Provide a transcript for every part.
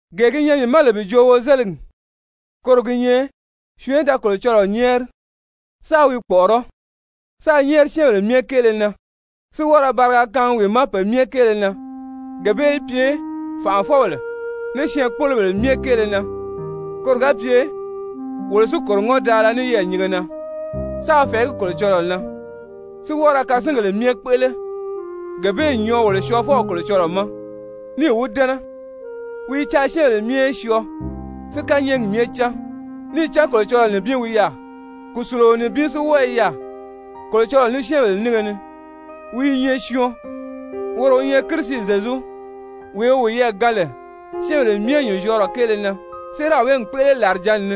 Gee gi nyɛ mii ma lè bi joo wozeligi, koro gi nyɛ syɔɔn í da Kolocɔlɔɔ nyɛ́ɛri, sáā wi kpɔ̀ʔɔrɔ́, sáā nyɛ́ɛri syɛ́ɛnbèle myɛ kéele na, si wɔ́ɔ ra bariga kaangi wi ma pe myɛ kéele na, gee bee í pye fànʔafɔbèle ní syɛɛnkpolobèle myɛ kéele na koro ga pye wolo si kòro ŋɔ́ndaala ní yɛɛ̀nyinge na, sáā fɛ̀ɛgí Kolocɔlɔɔ na, si wɔ́ɔ ra kasingèle myɛ kpéʔele. Gee bee n nyɔɔ wolo Syɔɔfɔw Kolocɔlɔɔ ma, níì wi dɛ́nɛ. Wi i caa syɛ́ɛnbèle myɛ í syɔɔ, si kányɛɛgi myɛ cán. Níì cán Kolocɔlɔɔ nibin wi yaà, kùsuluo nibin si wɔ́ɔ i yaà Kolocɔlɔɔ ní syɛ́ɛnbèle nínge ni, wi i nyɛ syɔɔn, woro wi nyɛ Kirisi Zyezu, wee wi wiyɛɛ gaan lè syɛ́ɛnbèle myɛ nyùnzyɔɔrɔ kéele na, séeraw bee n kpéʔele làrijǎnni ni.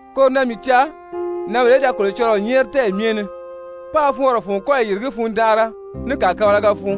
Koro na mii caa nǎnbèle í da Kolocɔlɔɔ nyɛ́ɛri tɛ́ɛyi myɛ ni, páā fɔɔnrɔ fun kɔ́yi yìrigí fundanʔara, ní kàkabalaga fun.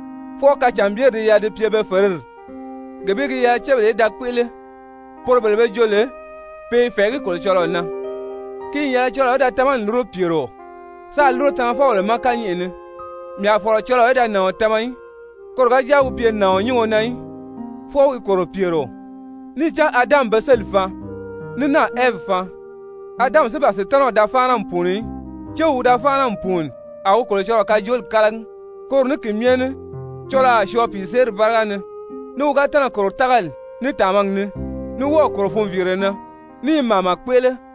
fwɔɔ kacànbyeri di yɛlɛ bi pye be fèredi, gee bee gi yɛlɛ cébèle í da kpéʔele, poro bele be jo lè pe i fɛ̀ɛgí Kolocɔlɔɔ na. Ki n yɛlɛ cɔlɔɔ í da tamani lúro pyèrio, sáā lúro tamafɔbèle ma kányɛʔɛ ni. Mii a fɔ̀lɔ cɔlɔɔ í da nàɔn tama í, koro ga jáa wi pye nàɔn nyúngo na í, fwɔɔ wi kòro pyèrio. Níì cán Adami be sélì faan, ní náà Ɛvi faan. Adami si ban Sutanaw da fáana n pùuni í, céw wi da fáana n pùuni a wi Kolocɔlɔɔ kajooli kálagi. Koro ní ki myɛ ní cɔlɔɔ a syɔɔ pìiseeri báriga ni, ní wi ga tɛ́nɛ̀ kòro tágali, ní tàmagi ni, ní wɔ́ɔ̀ kòro funviire na, ní i màama kpéʔele.